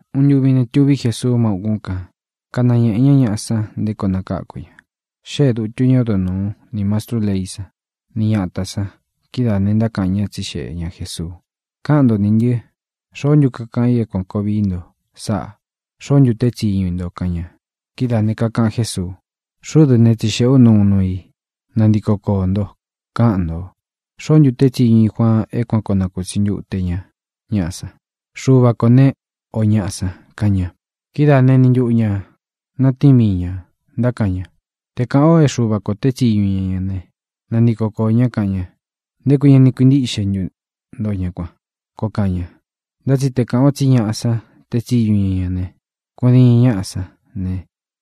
Uun ntuvi ne, tuví Jesuu má ukún kan, kanañēꞌe ñá ñaꞌa san nté koo nakáku ña. Xée dūtu ñá odo nūu, ni mastrú leí san, ni ñatā san. Kidáā ne, ntákaꞌan ñá, tsixeꞌe ña Jēsuu: —Kaꞌan ntó nī ntɨ: ¿Xoó ntu kakaꞌan i é kuān koo vií nto sáꞌā? ¿Xoó ntu teé tsiñu i nto? —kaꞌan ña. Kidáā ne, kakaꞌan Jésuu: —Xuꞌú dɨ ne, tsixeꞌē ú nto uun nuu i. Nantiko koō ntó, kaꞌan nto: ¿Xoó ntu teé tsiñu ī Juaan é kuan kōo nakutsi ntute ña ñaꞌa san: Xuva kō né, ō ñaꞌa san? —kaꞌan ña. Kidáa ne, eni ntuꞌu ñā natíin mii ñā, ntákaꞌan ña: —Te kāꞌan o é Xuva kō teé tsiñu ña ña ne, nantiko koō ñá, kaꞌan ña: “¿Nté kui ña ni kuīntíꞌxe ntu nto ña kuan?”, koo kaꞌan ña. Ntá tsi te kāꞌan o tsí ñaꞌa san teé tsiñu ña ña ne, kudiin ñáꞌa sán ne,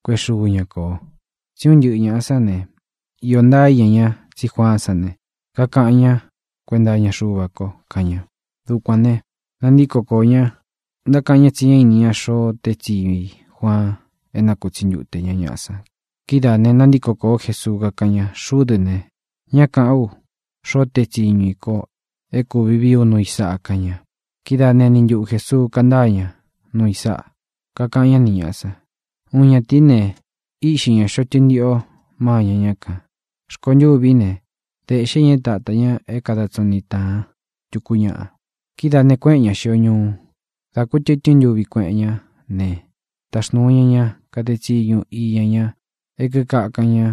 kuéꞌe xuu ña kō. Tsí un ntɨꞌɨ ñāꞌa sán ne, iō ntaa íña ña tsí Juaán san ne, kakaꞌan ñá kuenta iña Xuva ko —kaꞌan ña. Dukuān ne, nantíko koō ña, ntákaꞌan ñá tsi ñá ini ña xoo teé tsiñu i Juaan é nakūtsi ntute ña ñaꞌa san. Kidáā ne, nantíko kōó Jesuu, kakáꞌan ña: —Xuꞌú dɨ ne, ña káꞌan ú xoo teé tsiñu i ko é kūvi vií u nuu i sáꞌa —kaꞌan ña. Kidáa ne, eni ntuꞌu Jēsuu kántaa ña nuu i sáꞌa, kakaꞌan ñá ni ñāꞌa san: —Uun ñatīí ne, íꞌxi ña xōꞌo tɨntiꞌo mâña ñá kān. Rkontûví ne, dēꞌxé ña é tāta ña é kada tsiñu niꞌi tāan tuku ñaꞌa. Kidáā ne, kuéꞌen ña xīo ñuu. Dā kútɨtɨ́n ntuvi kueꞌen ñá ne, taxnūu ña ña kade tsiñu iña ña e kíkakan ña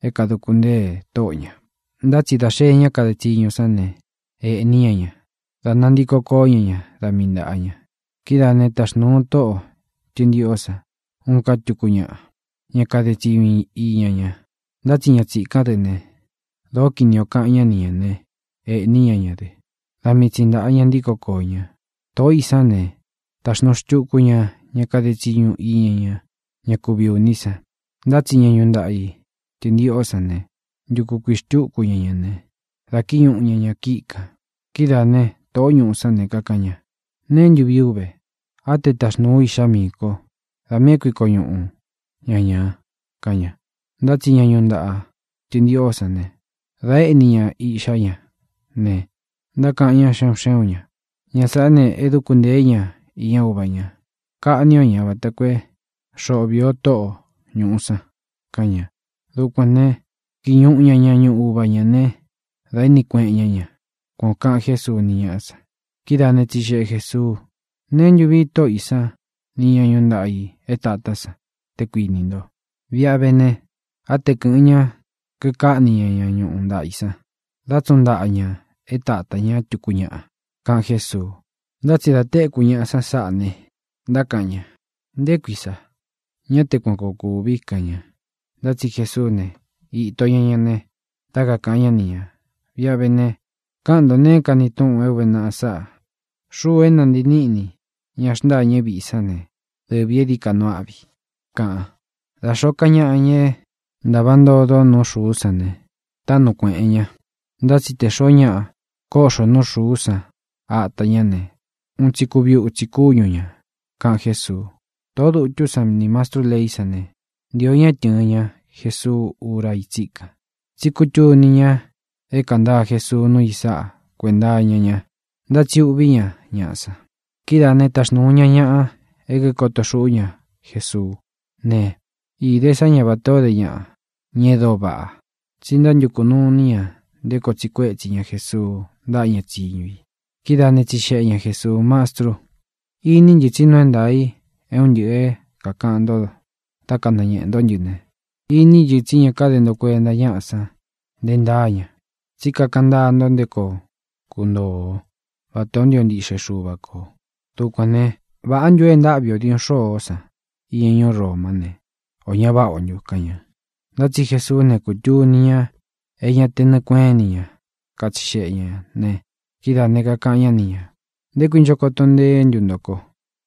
é kadūku ntée tóꞌo ñā, ntá tsi dā xee ñá kade tsiñu sán ne, ēꞌní ña ña, dá nantīko koó ña ña da mii ntāꞌa ña. Kidáā né, taxnūu tóꞌo tɨ̄ntiꞌó san uun ká tuku ñaꞌa, ña kade tsiñu iña ña, ntá tsi ña tsīkán dɨ ne, dōó kini ō kaꞌan ñá ni ñā né, ēꞌní ña ña dɨ. Da mii tsi ntāꞌa ña ntíko koō ña. Tōꞌó i sán ne, taxnūu xtuku ña ña kade tsiñu iña ña, ñá kuvi ūní san. Ntá tsi ña ñuꞌu ntaꞌa ī tɨntiꞌó san ne, ntuku kuiꞌī xtúku ña ña ne, dā kíñuꞌu ña ña kíꞌi kān. ʼKidáā né, tōꞌó ñuꞌu sán ne, kakaꞌan ña: “¿Neé ntu vii ú ve? Á te taxnūu ú iꞌxá miī ko. Da miī é kuiko ñuꞌu ña ñā”, kaꞌan ña. Ntá tsi ña ñuꞌu ntaꞌa tɨntiꞌo sán ne, dā íni ña iꞌxá ña ne, ntákaꞌan ñá xe un xé un ñā: “Ña sāꞌa é dūku ntée ña iña uva ña. Kaꞌní o ña vata koo é xoꞌo vīí o tóꞌo ñūꞌu san”, kaꞌan ña. Dukuān né, kīñuꞌu ña ña ñuꞌu uva ñā ne, dā éꞌni kueꞌen ñá ña —kuan ō kaꞌan Jésuu ni ñáꞌa san. Kidáa ne, tsixeꞌe Jēsuu: —¿Neé ntu vīi tóꞌo ī sán nī ñá ñuꞌu ntaꞌa ī é tātá san, te kuinī nto? Viꞌi a vé ne, á te kɨ̄ꞌɨn ña kikáꞌni ña ña ñuꞌu ntaꞌa ī san, dá tsuꞌun ntaꞌa ña é tāta ña tuku ñáꞌa —kaꞌan Jésuu. Ntá tsi dā téku ñaꞌa san sáꞌā ne, ntákaꞌan ña: —¡Nté kui sa! ¡Ña te kuan koo kúvi! —kaꞌan ña. Ntá tsi Jesuú ne, īto ña ña ne, dá kakāꞌan ñá ni ñā: —Viꞌi a vé ne, kaꞌan nto neé kani túꞌun é ūve naꞌa sáꞌa: Xúū é nantii níꞌni ña xntâñɨ víꞌi sán ne, dɨvī e dií ka nuu áꞌvi i, kaꞌan. Da xōó ka ñaꞌa, ña é ntāva ntodo nú xūu sáꞌa ne, táꞌnu kuēꞌen ña. Ntá tsi te xōo ñáꞌa kóꞌxo nuu xuú san ata ñá ne, un tsi kuvi utsi kúñu ñā —kaꞌan Jésuu. Tōꞌó dutú san nī mastrú leí san ne, ntīo ña é tɨ̄ɨn ña Jesuu úra í tsíkan, tsi kútuni ña é kāntaa Jesuu núu i sáꞌa kuenta iña ña, ntá tsi uꞌvī ñá ñaꞌa san. Kidáa ne, taxnūu ña ñaꞌa é kīkoto xúꞌu ña Jesuú ne, īde sá ña vatā ó de ñaꞌa, ña e dóo váꞌa, tsi ntántukū nuu iní ña nté koo tsiꞌi kuétsi ña Jesuu ntáꞌa ña tsiñu i. Kidáa ne, tsixeꞌe ña Jēsuu: —Mastru, iní ntɨ tsi nuu é ntaā i é un ntɨꞌɨ̄ é kākaꞌan nto dá kanañēꞌe ntó ntɨ ne, iní ntɨ tsí ña káde nto kuenta ñáꞌa san nte ntáa ña, tsí kakaꞌan ntáa nto nté koo kuntoo o vatā ó ntio ntiꞌxe Xuva kō. Dukuān né, ¿vāꞌá ntu ō e ntáꞌvi ō diuꞌun xôó san iña ñuú Romá ne, ō ña váꞌa ntu ō? —kaꞌan ña. Ntá tsi Jesuú ne, kūtuni ña é ña te nɨɨ kuéꞌen ini ña katsixeꞌe ñā ne, kidáā ne, kakaꞌan ñá ni ñā: —¿Nté kui ncho koto nteé ntu nto ko?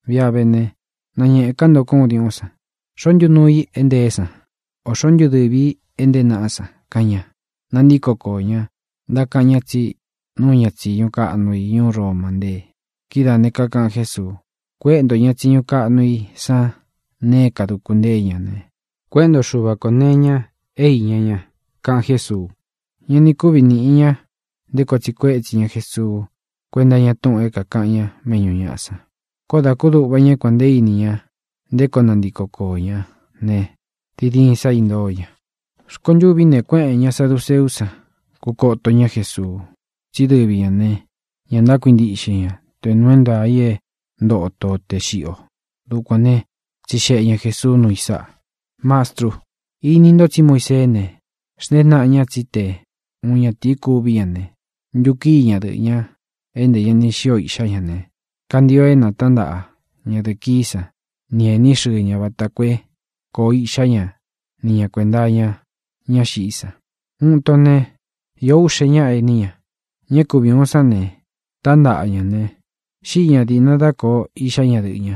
Viꞌi a vé ne, nāñeꞌe ká nto ko uun diuꞌún san. ¿Xoō ntú nuu i é ntēé san; ō xoó ntu dɨvī í e ntée naꞌá san? —kaꞌan ña. Nantíko koō ñá, ntákaꞌan ña tsí nuu ña tsiñu kaꞌnu i ñuú Roma ntée. Kidáā ne, kakaꞌan Jésuu: —Kuéꞌe ntō ña tsiñu kaꞌnu i san nee é kāduku ntée ña ne, kuéꞌe nto Xuva kō nee iña é iña ña —kaꞌan Jésuu. Ña ni kúvi nīꞌi ña nté koo tsiꞌi kuétsi ña Jesuu kuénta iña túꞌūn é kākaꞌan ñá méꞌñū ñaꞌa san. Koó dā kúduꞌva ña é kuān nte íni ña nté koo nantiko koō ñá ne, diin diin sa intóo ña. Rkontûví ne, kuéꞌēn ña saduceú san, kukoto ñá Jesuu. Tsí dɨvi ñā ne, ña ntákuintiꞌxe ña te nuu é ntaā i é ntoto o tē xiꞌi o. Dukuān né, tsixeꞌe ña Jēsuu núu i sáꞌa: —Mastru, ini nto tsí Muiseé ne, xntée naꞌa ña tsí te uun ñatīí kuví ña ne, ntukíi ñadɨꞌɨ̄ ña é ntē ña ni xío iꞌxá ña ne, kantio é nātántaꞌa ñadɨ̄ꞌɨ kií san ni ēní xɨɨ ña vata koo é kōo iꞌxá ña ni ñā kuenta iña ñá xiꞌí san. Uun ito ne, īó uꞌxe ñáꞌa ení ña. Ña é kuvi ūun sán ne, tántaꞌa ña ne, xíꞌi ña dīꞌna dá kōo iꞌxá ñadɨꞌɨ̄ ña.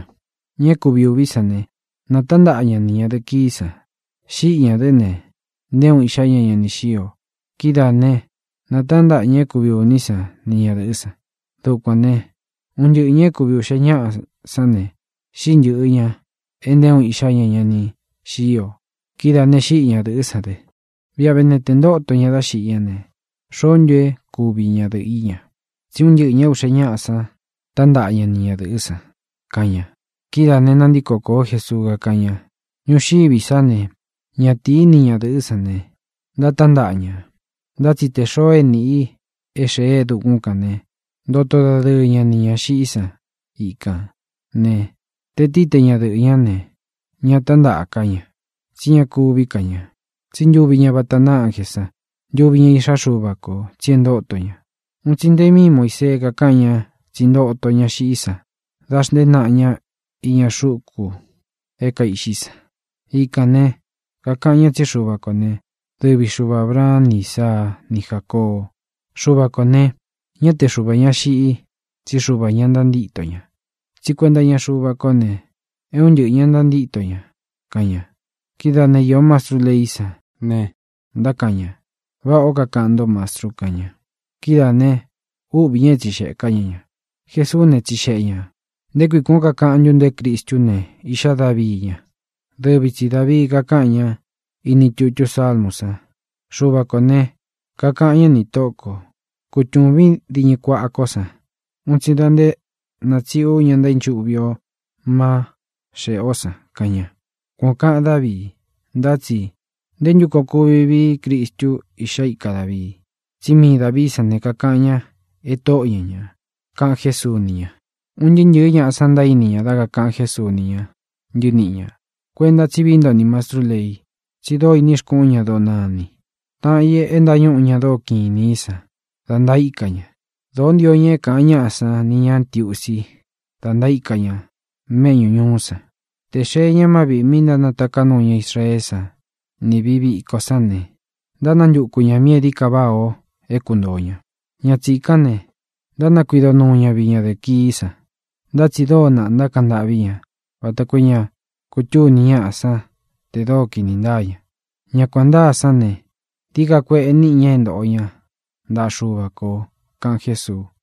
Ña é kuvi ūví san ne, natántaꞌa ña ni ñadɨ̄ꞌɨ kií san. Xíꞌi ñā dɨ́ ne, nté uun iꞌxá ña ña ni xío. Kidáa ne, nātántaꞌa ña é kuvi ūní san ni ñadɨ̄ꞌɨ́ san. Dukuān né, un ntɨꞌɨ ñā e kúvi uꞌxe ñáꞌa sán ne, xíꞌi ntɨ̄ꞌɨ ña e nté uun iꞌxá ña ña ni xío. Kidáā ne, xíꞌi ñadɨ̄ꞌɨ́ san dɨ. Viꞌi a vé ne, tē ntóto ña da xiꞌí ña ne, ¿xoó ntu é kuvi ña dɨꞌɨ ī ña? Tsí un ntɨꞌɨ̄ ña é uꞌxe ñáꞌa san tántaꞌa ña ni ñadɨ̄ꞌɨ́ san —kaꞌan ña. Kidáā ne, nantíko kōó Jesuu, kakáꞌan ña: —Ñuxiví sa ne, ñatīí ni ñadɨ̄ꞌɨ́ san ne, ntátántaꞌa ña. Ntá tsi tē xoo é nīꞌi i é xēe e dukún kān ne, ntoto dadɨɨ ña nī ña xiꞌí san ikān ne, tē tií te ña dɨꞌɨ̄ ñá ne, ña tántaꞌa ká ña. Tsí ña kuví ka ña, tsí ntuvi ña vata ntáa ánjē san, ntuvi ña iꞌxá Xuva kō, tsi e ntóto ña. Uun tsi nte míi Muīsee kakáꞌan ña tsí ntoto ña xiꞌí san da xntée naꞌa ña iña xuku é kaiꞌxi san. Ikān ne, kakaꞌan ña tsí Xuva kō né, dɨvi Xuva Ābraan ni Ísaa ni Jácoo. Xuva kō ne, ñá te Xuva ñā xiꞌi i, tsí Xuvā ña ntantíto ña. Tsí kuenta iña Xúva kó ne, é un ntɨꞌɨ ñā ntantíto ña —kaꞌan ña. Kidáā né, īó mastrú leí san ne, ntákaꞌan ña: —Váꞌā ó kakaꞌan ntó, Mastru —kaꞌan ña. Kidáā ne, úꞌvī ña e tsíxeꞌē ká ña ña. Jesuú ne, tsixeꞌe ñā: —¿Nté kui kuān ó kakaꞌan ntú nto é Cristú ne, iꞌxá Davii ña? Dɨvi tsi Dāvii kakáꞌan ña ini tutú Sálmū san: Xuva kō ne, kakaꞌan ñá nī Tóꞌō ko: “Kutūvín diñɨ kuaꞌa kó san un tsi da nté natsiꞌi ú ña ntaínchuꞌvi o má xeꞌē ó san”, kaꞌan ña. Kuan ō kaꞌan Dávii. Ntá tsi ¿nté ntu koo kuvi vií Cristu iꞌxá ika Dāvii? Tsí mii Dāvií san ne, kakaꞌan ña e Tóꞌo ña ñā —kaꞌan Jésuu ni ña. Un ntɨɨ́ ntɨ̄ɨ́ ñaꞌa san ntaíni ña dá kakāꞌan Jésuu ni ña ntɨníꞌi ñā: —Kuenta tsí vií nto nī mastrú lei, tsí dóo ini xkuꞌun ña doo nani, taꞌan i e ntañúꞌu ña e dóo kiꞌin inī í san, da ntaíka ña. Dōó ntio ña é kāꞌan ñáꞌa san ni ñā ntiusi da ntaíka ña méꞌñū ñuú san. Tē xee ñá má viꞌī mí ntánataká nuu ña Israeé san ni vīꞌi viko sán ne, ntánantuku ñā míꞌī e dií ka váꞌā o é kuntōo ña. Ña tsīkán ne, ntánakuido nuu ña viꞌi ñadɨ̄ꞌɨ kií san. Ntá tsi dóo naꞌa ntákaꞌan ntâꞌví ña vata koo é ña kutuni ñáꞌa san te dóo kini ntáa ña. Ña kuān ntáa sán ne, dií ka kueꞌe níꞌi ña é ntoꞌo ña ntaꞌa Xuva kō —kaꞌan Jésuu.